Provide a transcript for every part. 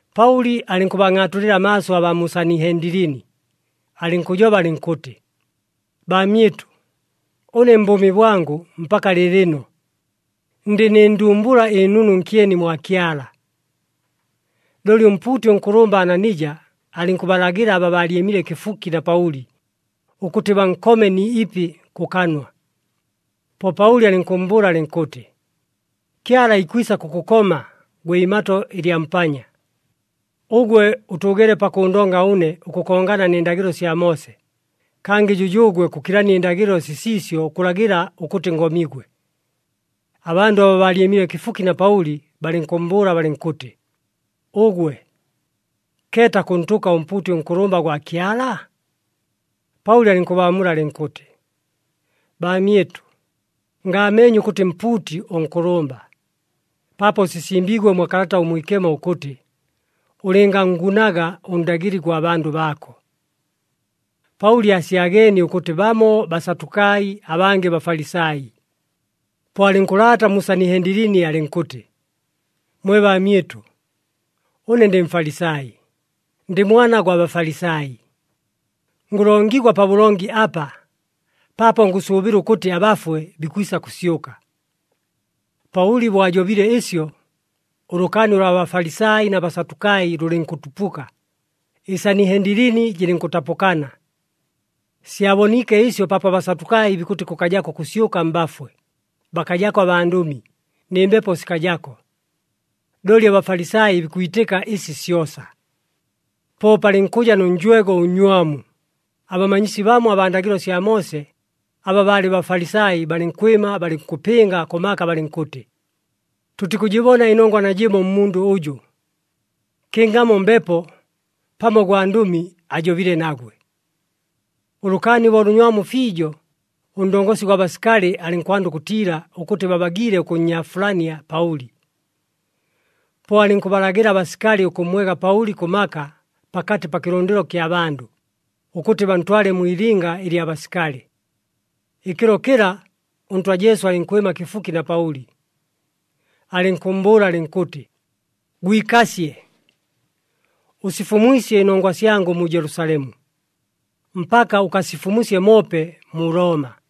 Paʉli alɨnkʉbangʼaatulɨla amaaso abaa mu Sanihendilini, alɨnkʉjoba alɨnkʉtɨ, “Baamyɨtʉ, ʉne mbʉʉmi bwangʉ mpaka lɨɨlɨno, ndɨ nɨ ndumbula ɨnunu nkyeni mwa Kyala.” Looli ʉmpuuti ʉnkʉlʉmba Ananija alɨnkʉbalagɨla aba baalyɨmile kɨfuki na Paʉli, ʉkʉtɨ bankome ni ipi kʉ kanwa. Po Paʉli alɨnkʉmmbʉʉla alɨnkʉtɨ, “Kyala ikwisa kʉkʉkoma, gwe imato ɨlya mpanya! Ʉgwe ʉtʉʉgeele pakʉʉndonga ʉne ʉkʉkongana nɨ ndagɨlo sya Moose, kangɨ jʉjʉʉgwe kʉkilania ɨndagɨlo sisiisyo ʉkʉlagɨla ʉkʉtɨ ngomigwe!” Abandʉ aba baalyɨmile kɨfuki na Paʉli balɨnkʉmmbʉʉla balɨnkʉtɨ, “Ʉgwe, keeta kʉntʉka ʉmpuuti ʉnkʉlʉmba gwa Kyala?” Paʉli alɨnkʉbaamula alɨnkʉtɨ, “Baamyɨtʉ, ngaameenye ʉkʉtɨ mpuuti ʉnkʉlʉmba, paapo sisimbiigwe mwa Kalata ʉMwikemo ʉkʉtɨ, ‘Ʉlɨnganngunaga ʉndagɨli gwa bandʉ baako.’” Paʉli aasyageenie ʉkʉtɨ bamo Basatukai, abangɨ Bafalisai, po alɨnkʉlaata mu Sanihendilini alɨnkʉtɨ, “Mwe baamyɨtʉ, ʉne ndɨ Mfalisai, ndɨ mwana gwa Bafalisai, ngʉlongigwa pabʉlongi apa paapo ngʉsʉʉbɨla ʉkʉtɨ abafwe bikwisa kʉsyʉka.” Paʉli bo ajobile ɨsyo, ʉlʉkaani ʉlwa Bafalisai na Basatukai lʉlɨnkʉtupuka, ɨSanihendilini jɨlɨnkʉtapʉkana. Syaboniike ɨsyo paapo aBasatukai bikʉtɨ kʉkajako ʉkʉsyʉka mbafwe, bakajako abandʉmi, nɨ mbepo sikajako. Looli aBafalisai bikwitɨka ɨsi syosa. Po palɨnkʉja nʉ njwego ʉnnywamu, abamanyisi bamo abaa ndagɨlo sya Moose aba baalɨ Bafalisai, balɨnkwɨma balɨnkʉpɨnga kʉ maka balɨnkʉtɨ, “Tʉtikʉjɨbona ɨnongwa najɨmo mmundʉ ʉjʉ. Kɨngamo mbepo, pamo gwandʉmi, ajobile nagwe.” Ʉlʉkaani bo lʉnywamu fiijo, ʉndongosi gwa basikali alɨnkwanda ʉkʉtiila ʉkʉtɨ babagiile ʉkʉnnyaafulania Paʉli. Po alɨnkʉbalagɨla abasikali ʉkʉmmwega Paʉli kʉ maka pakatɨ pa kɨlʉndɨlo kya bandʉ, ʉkʉtɨ bantwale mwi ilinga ɨlya basikali. Ɨkɨlo kɨla ʉNtwa Jesu alɨnkwɨma kɨfuki na Paʉli, alɨnkʉmmbʉʉla alɨnkʉtɨ, “Gwikasye, ʉsifumwisye ɨnongwa syangʉ mu Jelusalemu. Mpaka ʉkasifumusye moope mu Looma.”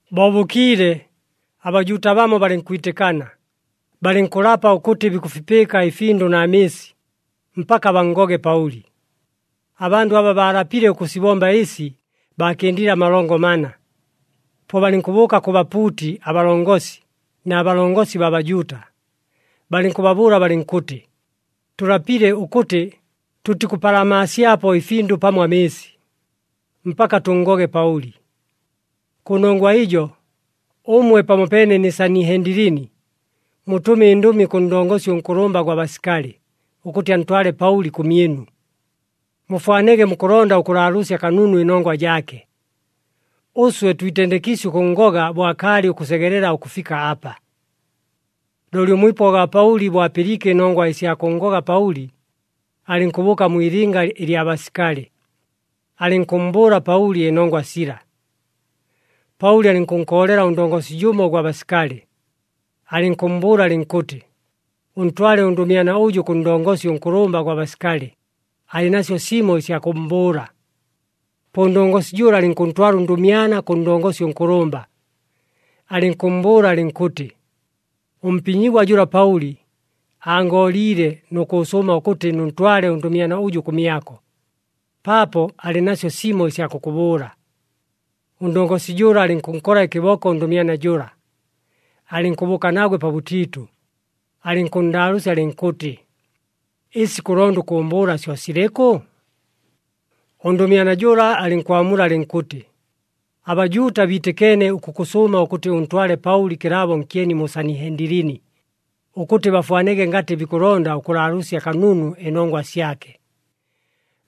Bo bʉkiile, aBajuuta bamo balɨnkwitɨkana, balɨnkʉlapa ʉkʉtɨ bikʉfipɨɨka ɨfindʉ na mɨɨsi, mpaka banngoge Paʉli. Abandʉ aba baalapile ʉkʉsibomba ɨsi baakɨndile amalongo mana. Po balɨnkʉbʉʉka kʉ bapuuti abalongosi na balongosi baa Bajuuta, balɨnkʉbabʉʉla balɨnkʉtɨ, “Tʉlapile ʉkʉtɨ tʉtikʉpalamaasyapo ɨfindʉ pamo amɨɨsi, mpaka tʉnngoge Paʉli. Kʉnongwa ɨjo, ʉmwe pamopeene nɨ Sanihendilini, mutʉme ɨndʉmi kʉ ndongosi ʉnkʉlʉmba gwa basikali ʉkʉtɨ antwale Paʉli kʉmyɨnu, mufwanege mukʉlonda ʉkʉlaalʉʉsya kanunu ɨnongwa jaake. Ʉswe twitendekiisye ʉkʉnngoga bo akaalɨ ʉkʉsegelela ʉkʉfika apa.” Looli ʉmwipwa gwa Paʉli bo apɨliike ɨnongwa ɨsya kʉnngoga Paʉli, alɨnkʉbʉʉka mwi ilinga ɨlya basikali, alɨnkʉmmbʉʉla Paʉli ɨnongwa sila. Paʉli alɨnkʉnkoolela ʉndongosi jʉmo ʉgwa basikali, alɨnkʉmmbʉʉla alɨnkʉtɨ, “Ʉntwale ʉndʉmyana ʉjʉ kʉ ndongosi ʉnkʉlʉmba gwa basikali, alɨ nasyo simo ɨsya kʉmmbʉʉla.” Po ʉndongosi jʉla alɨnkʉntwala ʉndʉmyana kʉ ndongosi ʉnkʉlʉmba, alɨnkʉmmbʉʉla alɨnkʉtɨ, “Ʉmpinyigwa jʉla Paʉli, angooliile nʉ kʉʉsʉʉma ʉkʉtɨ nʉntwale ʉndʉmyana ʉjʉ kʉmyako, paapo alɨ nasyo simo ɨsya kʉkʉbʉʉla.” Ʉndongosi jʉla alɨnkʉnkola ɨkɨboko ʉndʉmyana jʉla, alɨnkʉbʉʉka nagwe pabʉtiitʉ, alɨnkʉnndaalʉʉsya alɨnkʉtɨ, “Ɨsi kʉlonda ʉkʉʉmbʉʉla syo silɨkʉ?” Ʉndʉmyana jʉla alɨnkwamula alɨnkʉtɨ, “ABajuuta biitɨkeene ʉkʉkʉsʉʉma ʉkʉtɨ ʉntwale Paʉli kɨlaabo nkyeni mu Sanihendilini, ʉkʉtɨ bafwanege ngatɨ bikʉlonda ʉkʉlaalʉʉsya kanunu ɨnongwa syake.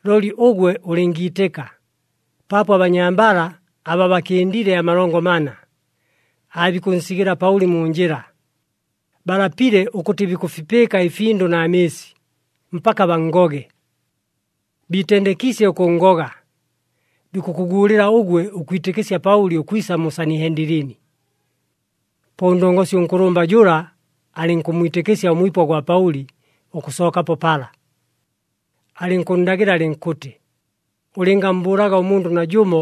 Looli ʉgwe ʉlɨngiitɨka, paapo abanyambala aba bakɨndile amalongo mana aabikʉnsigɨla Paʉli mu njɨla. Balapile ʉkʉtɨ bikʉfipɨɨka ɨfindʉ na mɨɨsi, mpaka banngoge. Biitendekiisye ʉkʉnngoga, bikʉkʉguulɨla ʉgwe ʉkwitɨkɨsya Paʉli ʉkwisa mu Sanihendilini.” Po ʉndongosi ʉnkʉlʉmba jʉla alɨnkʉmmwitɨkɨsya ʉmwipwa gwa Paʉli ʉkʉsookapo pala, alɨnkʉnndagɨla alɨnkʉtɨ, “Ʉlɨngammbʉʉlaga ʉmundʉ najʉmo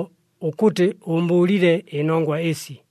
ʉkʉtɨ ʉʉmbʉʉlile ɨnongwa ɨsi.”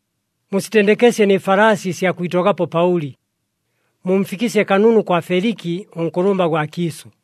Musitendekesye nɨ falaasi ɨsya kwitogapo Paʉli, mumfikɨsye kanunu kwa Feliki ʉnkʉlʉmba gwa kiisʉ.”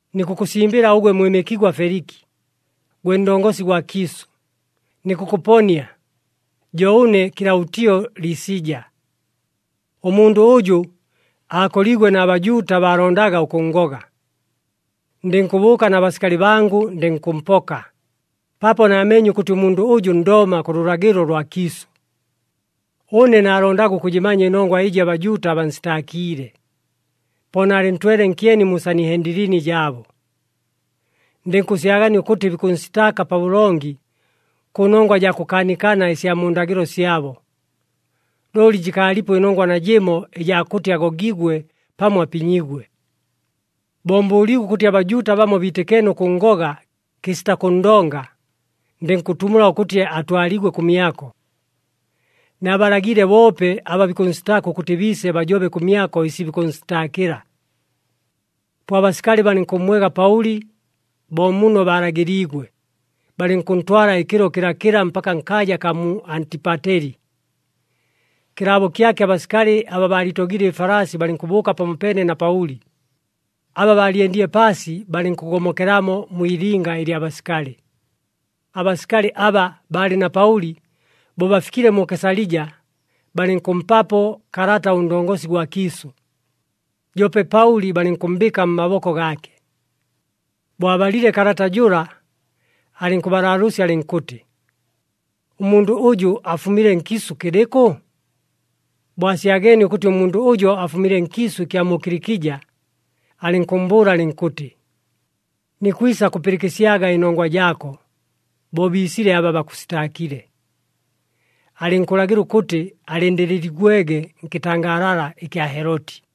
Nikʉkʉsimbɨla ʉgwe mwɨmɨkigwa Feliki, gwe ndongosi gwa kiisʉ, nikʉkʉponia, jo ʉne Kɨlaʉtio Lisija. Ʉmundʉ ʉjʉ aakoliigwe na Bajuuta, baalondaga ʉkʉnngoga. Ndɨnkʉbʉʉka na basikali bangʉ, ndɨnkʉmpoka, paapo naameenye ʉkʉtɨ ʉmundʉ ʉjʉ Ndooma kʉ lʉlagɨlo lwa kiisʉ. Ʉne naalondaga ʉkʉjɨmanya ɨnongwa ɨjɨ aBajuuta bansitaakiile, po naalɨntwele nkyeni mu Sanihendilini jaabo. Ndɨnkʉsyagania ʉkʉtɨ bikʉnsitaaka pabʉlongi, kʉnongwa jaa kʉkaanikana ɨsya mu ndagɨlo syabo. Looli jɨkaalipo ɨnongwa najɨmo ɨjaa kʉtɨ agogigwe pamo apinyigwe. Bo mbʉʉliigwe ʉkʉtɨ aBajuuta bamo biitɨkeene ʉkʉnngoga kɨsita kʉnndonga, ndɨnkʉtumula ʉkʉtɨ atwaligwe kʉmyako. Naabalagiile boope aba bikʉnsitaaka ʉkʉtɨ biise bajobe kʉmyako ɨsi bikʉnsitaakɨla. Po abasikali balɨnkʉmmwega Paʉli bo muno balagɨliigwe, balɨnkʉntwala ɨkɨlo kɨlakɨla mpaka nkaaja akaa mu Antipateli. Kɨlaabo kyake abasikali abaa baaliitogile ɨfalaasi balɨnkʉbʉʉka pamopeene na Paʉli, aba baalyendile paasi balɨnkʉgomokelamo mwi ilinga ɨlya basikali. Abasikali aba baalɨ na Paʉli bo bafikile mu Kesalija, balɨnkʉmpapo kalata ʉndongosi gwa kiisʉ, joope Paʉli balɨnkʉmmbɨɨka mmaboko gaake. Bo abalile kalata jʉla, alɨnkʉbalaalʉʉsya alɨnkʉtɨ, “Ʉmundʉ ʉjʉ afumile nkiisʉ kɨlɨkʉ?” Bo asyageenie ʉkʉtɨ ʉmundʉ ʉjo afumile nkiisʉ ɨkya mu Kilikija, alɨnkʉmmbʉʉla alɨnkʉtɨ, “Nikwisa kʉpɨlɨkɨsyaga ɨnongwa jaako, bo biisile aba bakʉsitaakile.” Alɨnkʉlagɨla ʉkʉtɨ alɨndɨlɨligwege nkɨtangaalala ɨkya Heloti.